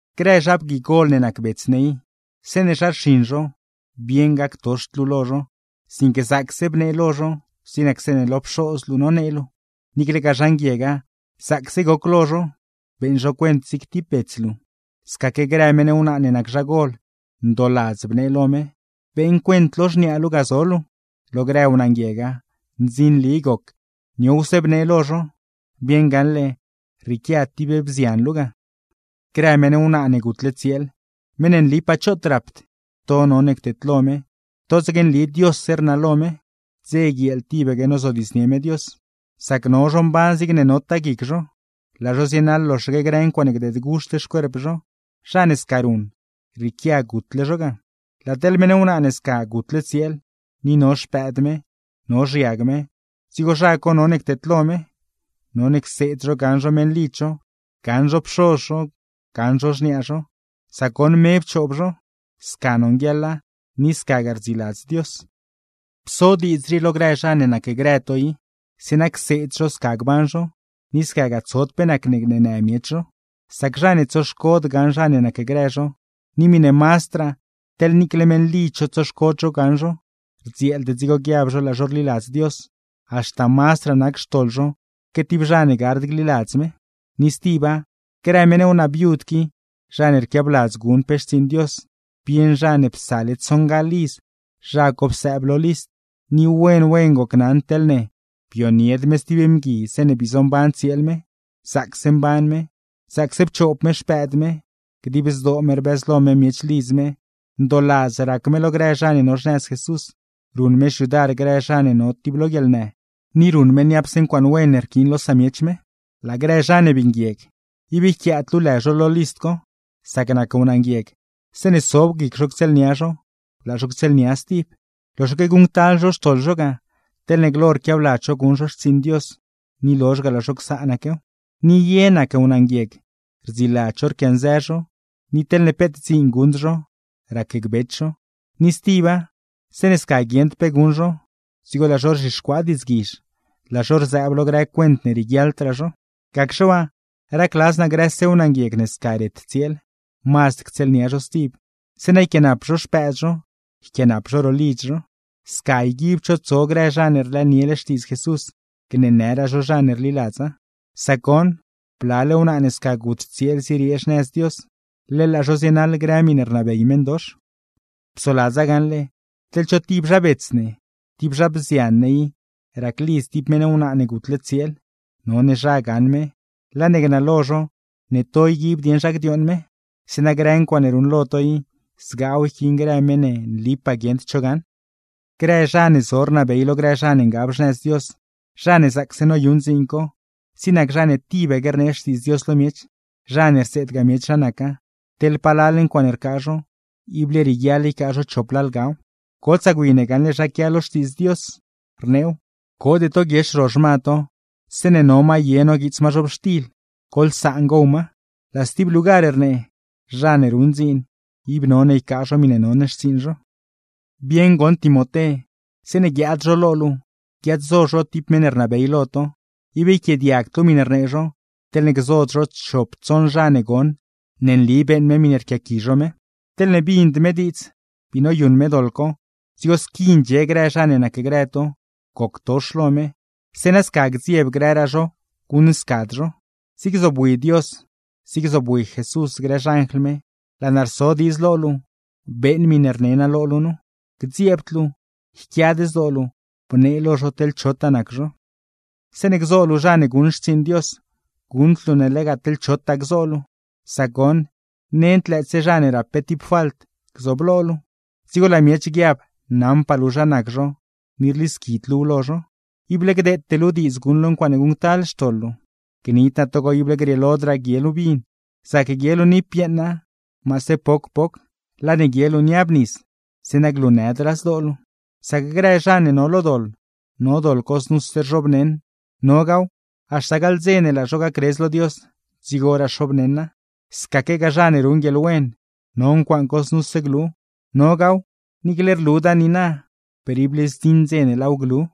Grë zha bgui gol ne nac bets ne i, zeeṉe zha rxiṉ zho, bieṉ gactoxd luu lo zho, sinque zaacse bnee lo zho zig nac zeeṉe lo pxoz luu nonee luu; niiclegaa zha nguiega, zaacse goc lo zho, beeṉ zho cuent zig tib bets luu. Scaque grë meṉ wnaa ne nac zhagol, ndooladz bnee lo me, beeṉ cuent lo xniaa luu ga zo luu; lo grë wnaa nguiega, ndzinli goc, niowse bnee lo zho, bieṉ gaṉle rrieequia tib bzian luu ga. Grë meṉ wnaa ne gutle tsieel, meṉ ne nlipaa choot rapd, to none cteedlo me; totsaque nli Diosse rnalo me, dze guieel tibaque nozodiidznie me Dios. Sac no zho mban zigne notaa guic zho, laa zho zienaḻ loxaque grë ncuaaṉe gdeed guxt xcuerp zho; zha ne sca ruṉ, rrieequia gutle zho ga. Laa teḻ meṉ wnaa ne scaque gutle tsieel, ni no xpëëd me, no xiag me, dzigo zha none cteedlo me; none cseed zho gaṉ zho meṉlidz zho, gaṉ zho pxoz zho, gaṉ zho xniaa zho, sac goṉ me pchoob zho. Sca nonguieḻa, ni scagaa rdziladz Dios. Pso diidz rii lo grë zha ne nacgrë to i, zeeṉa cseed zho sca gban zho, ni scagaa tsod pe nacne gneenë miech zho. Sac zha ne tsoxcod gaṉ zha ne nacgrë zho, ni miṉe mazdraa teḻne niicle meṉlidz zho tsoxcod zho gaṉ zho, rdzieeld dzigo guiab zho laa zho rliladz Dios, haxta mazdraa nac xtoḻ zho que tib zha ne gard gliladz me. Ni stiba, grë meṉ wnaa viud qui zha ne rquiabladz guṉ pe xtsiiṉ Dios, bieṉ zha ne psale tsoṉgaḻ iz zha co psëëb lo list. Ni wen wen gocnaṉ teḻne: bionied me stib mgui zeeṉe bii zomban tsieel me, zaacse mban me, zaacse pchoob me xpëëd me, dib zdoo me rbëzlo me miech lidz me, ndooladz rac me lo grë zha ne no xnëz Jesús, ruṉ me xyudar grë zha ne no lo tib guieḻnë; ni ruṉ me niapse ncuaaṉe wen ne rquiin lo samiech me. Laa grë zha ne bii nguieg, ib yquiaad luu lë zho lo list co; sac nac wnaa nguieg, zeeṉe sob guic zho ctsieelnia zho, laa zho ctsieelnia stib. Loxaque guṉctal zho xtoḻ zho ga, teḻne glo rquiabladz zho guṉ zho xtsiiṉ Dios ni lozh ga laa zho csaanaquew. Ni ye nac wnaa nguieg, rdziladz zho rquianzë zho; ni teḻne peet dziin guṉd zho, racgbech zho; ni stiba, zeeṉe sca guieṉd pe guṉ zho dzigo laa zho rzhixcuaa diidzguizh, laa zho rzëëb lo grë cuent ne rieguiaḻdraa zho. Gacxe waa, racladz naa grëse wnaa nguieg ne sca ret tsieel, mazd ctsieelnia zho stib; zeeṉa yquiaanap zho xpëëd zho, yquiaanap zho ro lidz zho. Sca yguibd zho tso grë zha ne rlëëniele Xtiidz Jesús, gneenëraa zho zha ne rliladza. Sac goṉ, blale wnaa ne sca gut tsieel zieriee xnëz Dios, leḻ laa zho zienaḻ grë miṉe rnabey meṉdox. Psoladza gaṉle, teḻ cho tib zha bets ne, tib zha bzian ne i raclidz tib meṉ wnaa ne gutle tsieel, none zha gaṉ me, laa ne gnalo zho ne to yguib dieṉ zha gdiooṉ me; zeeṉa grë ncuaaṉe ruṉlo to i, zgaaw yquiin grë meṉ ne nlipaa guieṉd cho gaṉ. Grë zha ne zo rnabey lo grë zha ne ngab xnëz Dios, zha ne zaacse noyuṉ dziin co, zig nac zha ne tibaque rnee Xtiidz Dios lo miech, zha ne rseedgaa miech zha naca, teḻ palal ncuaaṉe rcaa zho, ible rieguiaḻ ycaa zho chop lalgaw. Gotsaa gwi ne gaṉle zha quia lo Xtiidz Dios, rneew: “Code to guiex ro xma to, zeeṉe no ma ye noguiits ma zhobxtil; ¡goḻsaan gow ma!” Laa stib lugar rnee: “Zha ne ruṉ dziin, ib none ycaa zho miṉe non xtsiiṉ zho.” Bieṉ goṉ Timoté, zeeṉe guiaad zho lo luu, guiaad-zo zho tib meṉ ne rnabey lo to, ib yquiaadiagd luu miṉe rnee zho, teḻne gzod zho chop tsoṉ zha ne goṉ ne nli beeṉ me miṉe rquiaqui zho me. Teḻne bind me diidz, bii noyuṉ me doḻ co, dzigo squi ndxie grë zha ne nacgrë to, goctox lo me; zeeṉa sca gdzieb grëraa zho guṉscad zho. Zig zobwi Dios, zig zobwi Jesús grë xanjl me, laa naa rso diidz lo luu, beeṉ miṉe rne naa lo luu nu. Gdzieebd luu, yquiad zdoo luu, bnee lo zho teḻ chotaa nac zho. Zeeṉe gzo luu zha ne guṉ xtsiiṉ Dios, guṉd luu ne lega teḻ chotaa gzo luu; sac goṉ, nend lëëtse zha ne rap pe tib falt gzooblo luu, dzigo laa miech guiab naṉpaa luu zha nac zho ni rlisquid luuw lo zho. Ible gdeete luu diidz guṉ luu ncuaaṉe guṉctal xtoḻ luu. (Gnid naa togo ible grieelodraa guie luu vin, zac guie luu niipyeeṉa maase poc poc, laa ne guie luu niab nis; zeeṉa glunëdraa zdoo luu.) Sac grë zha ne no lo doḻ, no doḻ co znuse rzhoobneṉ; nogaaw, haxta gaḻ dze ne laa zho gacredz lo Dios, dzigoraa xoobneṉa. Scaquegaa zha ne ruṉ guieḻwen, no ncuaaṉ co znuse glu; nogaaw, niicle ne rluda niina per ible zdziṉ dze ne laaw glu.